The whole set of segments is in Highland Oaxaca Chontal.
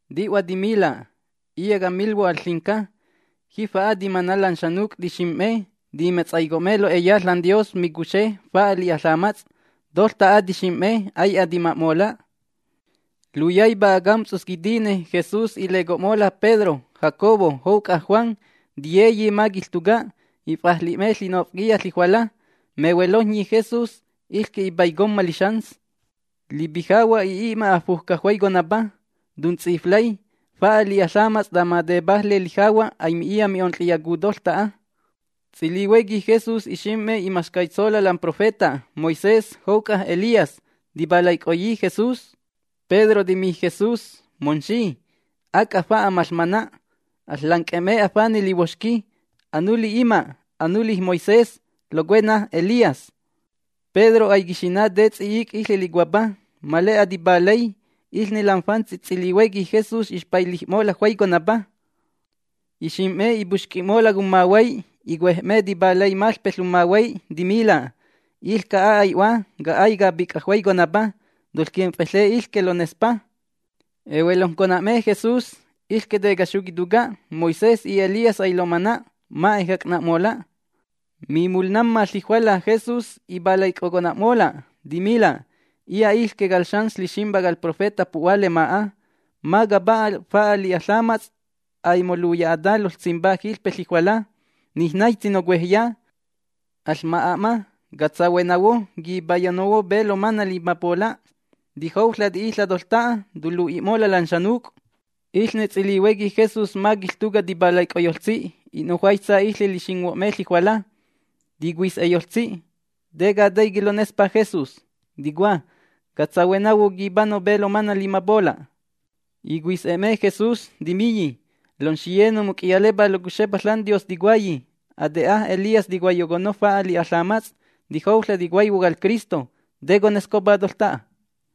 Ti'hua timila': ―Iya' camilhuo' al ƚinca: Jifa'a timana' lan xanuc' tixim'me, timetsaico'me lo'eya ȽanDios micuxe fa'a li'a ƚamats'. Toƚta'a tixim'me ai'a tima'mola'. Luyaipa acamts'us quitine Jesús ileco'mola' Pedro, Jacobo jouc'a Juan. Tiyeyi ma quiƚtuca'. If'ajli'me ƚi'nof'quiya ƚijuala. Mehuelojnyi Jesús iƚque ipaicomma lixans. Lipijahua' i'i'ma afujca juaiconapa, tunts'iflay. Fa'a li'a ƚamats' tama tepajle lijahua' aimi'iya mi'onƚiyacu toƚta'a. Ts'ilihuequi Jesús ixim'me imaxcaitsola' lam profeta Moisés jouc'a Elías. Tipalaic'oyi Jesús. Pedro timi Jesús: ―Momxi, ¡ac'a fa'a maƚmana'! Aƚƚanc'e'me afanej lihuoxqui, anuli ima', anuli Moisés, locuena Elías. Pedro aiquixina' te ts'i'ic' iƚe licuapa, ma le'a tipalay. Iƚne lam fantsi ts'ilihuequi Jesús ixpailij'mola' juaiconapa. Ixim'me ipoxc'i'mola' cummahuay. Icuej'me tipalay maƚpe ƚummahuay, timila': ―Iƚca'a ai'Hua, ca'ay capic'a juaiconapa. Toƚquimf'eƚe iƚque lonespa. Ehuelojncona'me Jesús, iƚque tecaxu quituca'. Moisés y Elías ailomana'. Ma ejac'na'mola'. Mimulnamma ƚijuala Jesús ipalaic'ocona'mola', timila': ―Iya' iƚque cal Xans Ƚiximpa cal profeta pu'hua lema'a, ma capa'a fa'a li'a ƚamats' aimoluya'ata loƚsimpa jiƚpe ƚijuala. Nij naitsi nocuejya. Aƚma'a'ma, catsahuenahuo quipayonahuo pe lomana' limapola', tijouƚa' ti'iƚa' toƚta'a tolu'i'mola' lan xanuc'. Iƚne ts'ilihuequi Jesús ma quiƚtuca' tipalaic'oyoƚtsi, i'nujuaista iƚe lixinghuo'me ƚijuala. Ticuis'eyoƚtsi: ―¿Te cataiqui' lonespa Jesús? Ticua: “Catsahuenahuo, quipano pe lomana' limapola'”. Icuis'e'me Jesús, timiyi: ―Lomxiye nomuc'iyalepá locuxepa ȽanDios ticuayi: “Ate'a Elías ticuaiyoconno fa'a li'a ƚamats'. Tijouƚa' ticuaihuo cal Cristo.” ¿Te conescopa toƚta'a?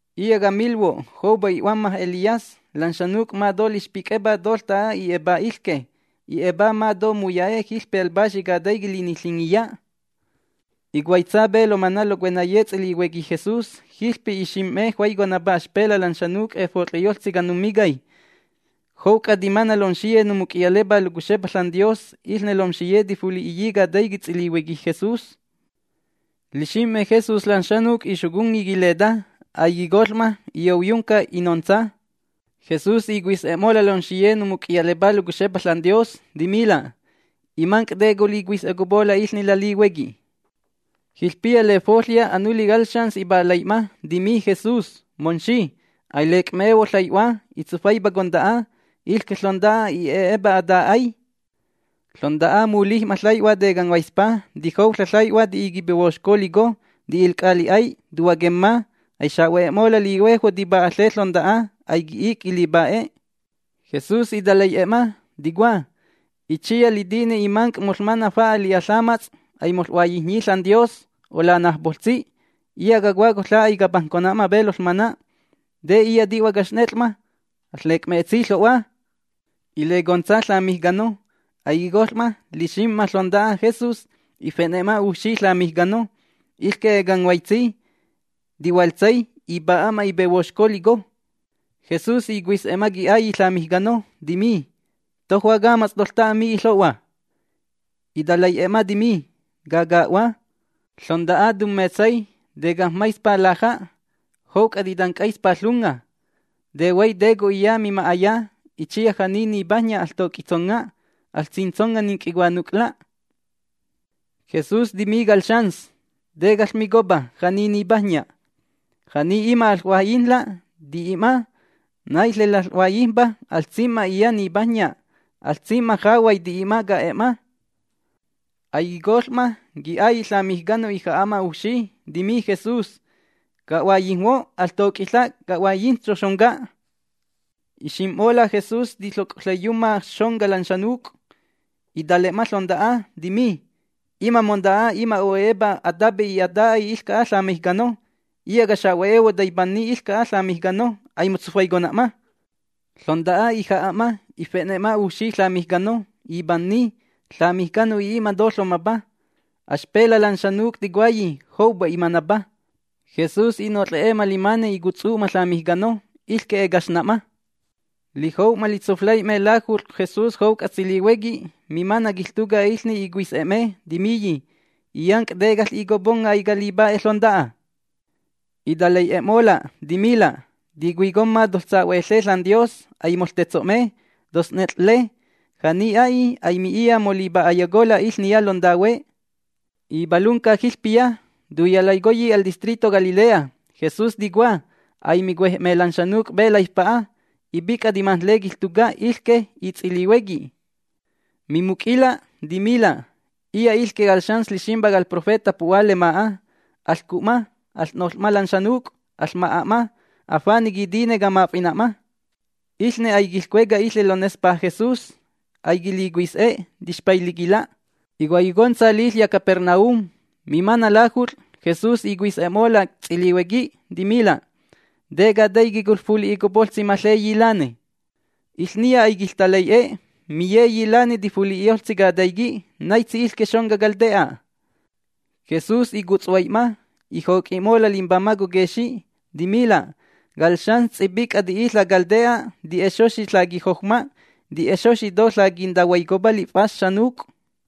’Iya' camilhuo', joupa i'huamma Elías. Lan xanuc' ma to lixpic'epa toƚta'a i'e'epá iƚque. I'e'epá ma to muya'e' jiƚpe al Paxi Cataiqui' Liniƚingiya. Icuaitsa pe lomana' locuenaye ts'ilihuequi Jesús, jiƚpe ixim'me juaiconapa axpela' lan xanuc' efot'ƚeyoƚtsi canumicay. Jouc'a timana' lomxiye nomuc'iyalepá locuxepa ȽanDios. Iƚne lomxiye tifuli'iyi cataiqui' ts'ilihuequi Jesús. Lixim'me Jesús lan xanuc' ixoconni quileta. Aiquicoƚ'mola', iyouyunca, inontsa. Jesús icuis'e'mola' lomxiye nomuc'iyalepá locuxepa ȽanDios, timila': ―Imanc', ¿te colicuis'epola' iƚne lalihuequi? Jiƚpiya lefoƚya anuli cal xans ipalai'ma, timi Jesús: ―Momxi, ailec'mehuo' ƚai'hua. Itsufaipa conta'a. Iƚque ƚonta'a i'e'epa ata'ay. Ƚonta'a mulij'ma ƚai'hua tecanghuaispa. Tijouƚa' ƚai'hua ti'i quipehuoxco lico, ti'ilc'a li'ay, tuhuaquemma. Aixa'hue'mola' lihuejhuo' tipa'aƚe ƚonta'a. Aiqui'ic' quilipa'e. Jesús italai'e'ma, ticua: ―Itsiya litine imanc' noƚmana' fa'a li'a ƚamats' aimoƚ'huaiyijnyi ȽanDios, olanajpoƚtsi. Iya' cacua, coƚa' aicapajncona'ma pe loƚmana'. ¿Te iya' ti'hua caxnet'ƚ'ma? Aƚƚec'metsi ƚo'hua. Ilecontsa ƚamijcano. Aiquicoƚ'ma, lixim'ma ƚonta'a Jesús, ife'ne'ma ujfxi ƚamijcano. Iƚque ecanghuaitsi, ti'huaƚtsay, ipa'a'ma ipehuoxco lico. Jesús icuis'e'ma qui'ailli' ƚamijcano, timi: ―¿Tojua camats' toƚta'a mi'i ƚo'hua? Italai'e'e'ma timi: ―Caca'hua. Ƚonta'a tummetsay, tecajm‑maispa laja' jouc'a titanc'aispa ƚunga. Tehuay te co'iya mima'aya. Itsiya ja'ni nipajnya, ¡aƚtoc'itsonga'! ¡Aƚsintsonga' ninc'icuanuc'la! Jesús timi cal xans: ―¿Te caƚmicopa: “Ja'ni nipajnya”? Ja'ni ima' aƚ'huaiyijnla', ti'i'ma. Naiƚne laƚ'huaiyijmpa aƚsim'ma iya' nipajnya, aƚsim'ma jahuay ti'i'ma ca'e'ma. Aiquicoƚ'ma, qui'ailli' ƚamijcano ija'a'ma ujfxi, timi Jesús: ―Ca'huaiyijnhuo', ¡aƚtoc'iƚa' ca'huaiyijntso' xonca! Ixim'mola' Jesús tiƚoc'oƚaiyumma xonca lan xanuc', itale'ma ƚonta'a, timi: ―Ima' monta'a, ima' o'e'epa atape y ata'ay iƚca'a ƚamijcano. Iya' cacuxe'ehuo', ¡taipanni iƚca'a ƚamijcano! Aimotsufaicona'ma. Ƚonta'a ija'a'ma. Ife'ne'ma ujfxi ƚamijcano. Ipananni. Ƚamijcano i'i'ma to ƚomapa. Axpela' lan xanuc' ticuayi: “Joupa imanapa”. Jesús i'noƚ'e'ma limane icutsu'ma ƚamijcano, iƚque ecaxna'ma. Lijou'ma litsuflai'me lajut'ƚ Jesús jouc'a ts'ilihuequi, mimana' quiƚtuca' iƚne icuis'e'me, timiyi: ―Illanc', ¿te caƚ'icoponga' aicalipa'e ƚonta'a? Italai'e'e'mola', timila': ―Ticuicomma toƚsa'hueƚe ȽanDios, aimoƚtetso'me, toƚsnet'ƚƚe. Ja'ni a'i, aimi'iya molipa'ayacola' iƚniya lontahue. Ipalunca jiƚpiya. Tuyalaicoyi al distrito Galilea. Jesús ticua: “Aimicuej'me lan xanuc' pe laifpa'a”. Ipic'a timajnle quiƚtuca' iƚque y ts'ilihuequi. Mimuc'ila' timila': ―Iya' iƚque cal Xans Ƚiximpa cal profeta pu'hua lema'a. Aƚcu'ma, aƚ'noƚ'ma lan xanuc', aƚma'a'ma. Afane' quitine, camaf'ina'ma. Iƚne aiquiƚcueca iƚe lonespa Jesús. Aiquilicuis'e. Tixpailiquila'. Icuaiyocontsa liƚya' Capernaum. Mimana' lajut'ƚ, Jesús icuis'e'mola' ts'ilihuequi, timila': ―¿Te cataiqui' coƚfuli'icopoƚtsi maƚeyi lane? Iƚniya aiquiƚtalai'e. Miyeyi lane tifuli'iyoƚtsi cataiqui' naitsi iƚque xonca cal te'a. Jesús icutshuai'ma, ijoc'i'mola' limbamaj coquexi', timila': ―Cal xans ts'ipic'a ti'iƚa' cal te'a, ti'e'exoxi ƚaquijoujma, ti'e'exoxi to ƚaquintahuaicopa lif'as xanuc'.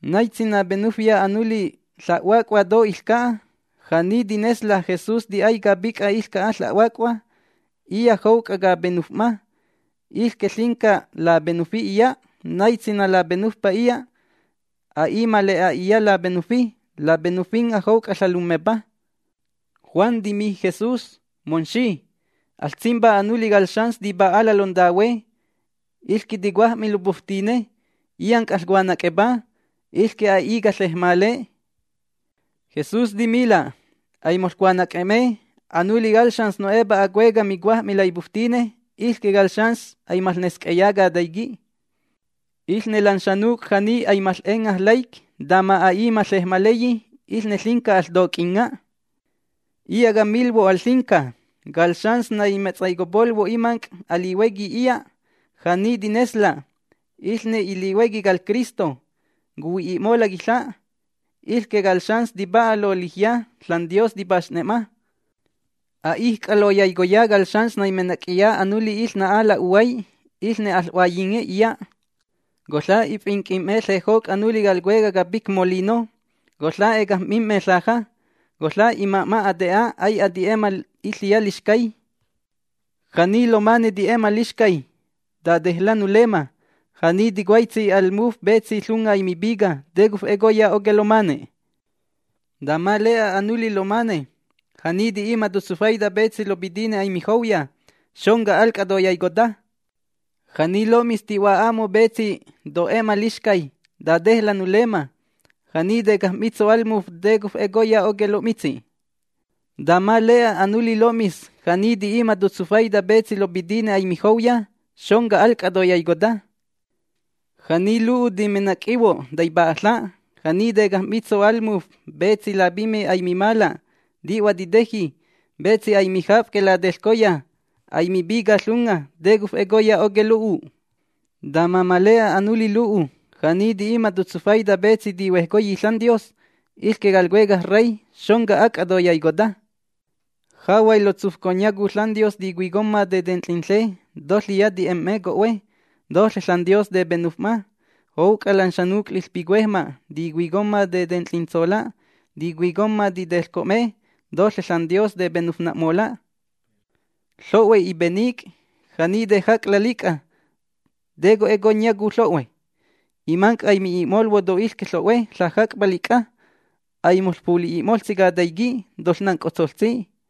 ―Naitsi napenufya anuli ƚahuac'hua to iƚca'a, ja'ni tinesla': “Jesús ti'ay capic'a iƚca'a ƚahuac'hua, iya' jouc'a capenuf'ma”, iƚque ƚinca lapenufi iya'. Naitsi nalapenufpa iya' a'i ma le'a iya' lapenufi, lapenufinga' jouc'a Ƚalummepa. Juan timi Jesús: ―Momxi, aƚsimpá anuli cal xans tipa'ala' lontahue. Iƚque ticuaj'mi lopuftine. Illanc' aƚcuanac'epá. Iƚque a'i caƚejmale. Jesús timila': ―Aimoƚcuanac'e'me. Anuli cal xans no'epa acueca' micuaj'mi laipuftine, iƚque cal xans aimaƚnesc'eya cataiqui'. Iƚne lan xanuc' ja'ni aimaƚ'enga' laic' tama a'i maƚejmaleyi, iƚne ƚinca aƚtoc'inga'. ’Iya' camilhuo' al ƚinca: Cal xans naimetsaicopolhuo' imanc' alihuequi iya', ja'ni tinesla': “Iƚne ilihuequi cal Cristo. Cuhui'i'mola' quiƚja'”, iƚque cal xans tipa'a lolijya, ȽanDios tipaxne'ma. ’A'ijc'a loyaicoya cal xans naimenac'iya anuli iƚna'a la'uhuay, iƚne aƚ'huaiyinge iya'. Coƚa' ifinc'im'me ƚejoc' anuli cal cuecaj capic molino, coƚa' ecajm'mim'me ƚaja. Coƚa' ima'ma ate'a ai'a ti'e'ma iƚiya lixcay. ’Ja'ni lomane ti'e'ma lixcay, ¡tatejla' nulemma! Ja'ni tocuaitsi al muf petsi ƚunga aimipica, ¿te cof'ecoya oque' lomane'? Tama le'a anuli lomane, ja'ni ti'i'ma totsufaita petsi lopitine aimijouya, xonca al c'a toyaicota. ’Ja'ni lo'mis ti'hua'a'mo' petsi to'e'ma lixcay, ¡tatejla' nulemma! Ja'ni tecajm‑mitso' al muf, ¿te cof'ecoya oque' lo'mitsi'? Tama le'a anuli lo'mis, ja'ni ti'i'ma totsufaita petsi lopitine aimijouya, xonca al c'a toyaicota. ’Ja'ni lo'u timenac'ihuo', ¡taipa'aƚa'! Ja'ni tecajm'mitso' al muf petsi lapimí aimimala', ti'hua titeji, petsi aimijaf'que lateƚcoya, aimipica ƚunga, ¿te cof'ecoya oque' lo'u'? Tama ma le'a anuli lo'u, ja'ni ti'i'ma totsufaita petsi tihuejcoyi ȽanDios, iƚque cal Cuecaj Rey, xonca al c'a toyaicota. ’Jahuay ƚotsufconyacu ȽanDios ticuicomma tetenƚinƚe, toƚiya ti'em'me co'hue, toƚe ȽanDios tepenuf'ma. Jouc'a lan xanuc' liƚpicuejma' ticuicomma tetenƚintsola', ticuicomma titeƚco'me, toƚe ȽanDios tepenufna'mola'. Ƚo'hue ipenic'. Ja'ni tejac'la' lic'a, ¿te conƚ'ecoyacu ƚo'hue? Imanc' aimi'i'molhuo' to iƚque ƚo'hue ƚejac'pa lic'a. Aimoƚfuli'i'moƚtsi cataiqui'. Toƚnanc'otsoƚtsi.